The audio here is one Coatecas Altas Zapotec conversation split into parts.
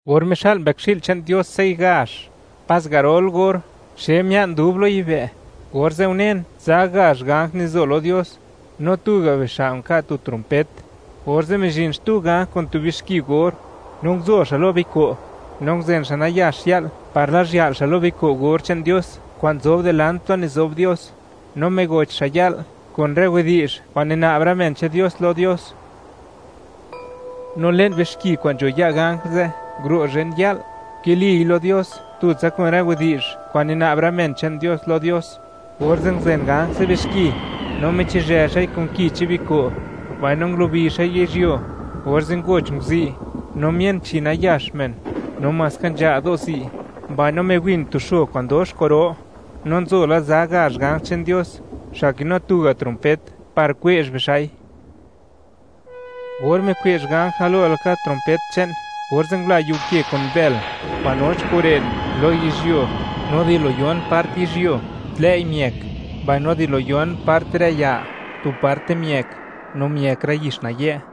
Or mixa'l Mbëkxi'l che'n Dios sey gazh, pas garol or, xe mia'n dub lo yibë', orze' unen, za gazh ganj nizo lo Dios, no tuga' bixa' nka' tu trompet, orze' mizhin xtu ganj kun tu bixki or, no nguzo xa' lo biko', no nguzen xa' nayax ya'l par lazhya'l xa' lo biko' or che'n Dios kwa'n nzob dilant plo nizob Dios, no migoch xa' ya'l kun rë widi'zh kwa'n nina'b rë men che'n Dios lo Dios, no le'n bixki kwa'n nzho ya' ganj ze' nguro' zhen ya'l, nkiliy lo Dios tutsa kun rë widi'zh kwa'n nina'b rë men che'n Dios lo Dios, orze' nguzen ganj ze' bixki, no michizhë xa'i kun ki che'n biko', mbaino ngulubi xa'i yizhyuo; orze' ngoch nguzi', no mien chi nayax men, no maska nzha' do' zi', mbaino miwin tu xo kwa'n dox kwa'ro. No nzo la za gazh ganj che'n Dios, xa' kinu tuga' trompet, par kwe'zh bixa'i. Or mikwe'zh ganj galo laka trompet che'n, orze' ngula yiu ke kun bël kwa'n noch kun ren lo yizhyuo, no di lo yon part yizhyuo, tlëi' miëk; mbaino di lo yon part rë ya, tu parte miëk; no miëk rë yix nayë'.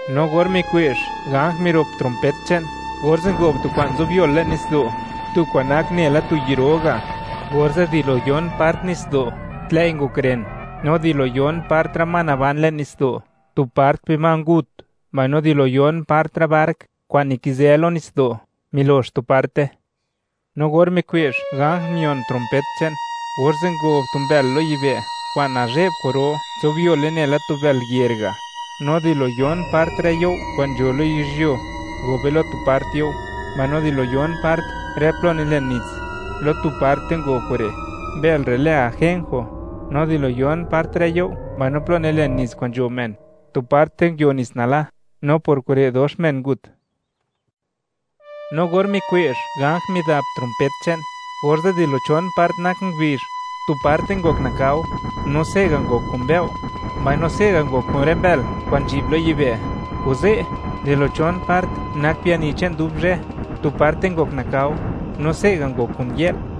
No or mikwe'zh ganj mirop trompet che'n, orze' ngob tu kwa'n nzobyol le'n nitsdo', tu kwa'n nak nela tu yi' ro ga', orze' di lo yon part nitsdo', tlëi' ngok ren; no di yon part rë ma naban le'n nitsdo', tu part bima ngut; mbaino di lo yon part rë bark kwa'n nikizë lo nitsdo', milox tu parte. No or mikwe'zh ganj mion trompet che'n, orze' ngob tu mbël lo yibë' kwa'n nazhe'b kwa'ro, nzobyole nela tu bël yer ga', no di lo yon part rë you' kwa'n nzho yizhyuo, ngobe lo tu part you'; mbaino di lo yon part rë plo nilen nits, lo tu parte ngob kure'. Mbël re' lë Ajenjo; no di lo yon part rë you' mbaino plo nilen nits kwa'n nzho men, tu parte nguio nits nala; no por kure', dox men ngut. No or mikwe'zh ganj midap trompet che'n, orze' di lo chon part nak ngubizh, tu parte ngok nakao, no se'ga' ngok kun mbëo'; mbaino se'ga' ngok kun rë mbël kwa'n nzhi'b lo yibë'; kuze', di lo chon part nak biani che'n dub zhë, tu parte ngok nakao, no se'ga' ngok kun yë'l,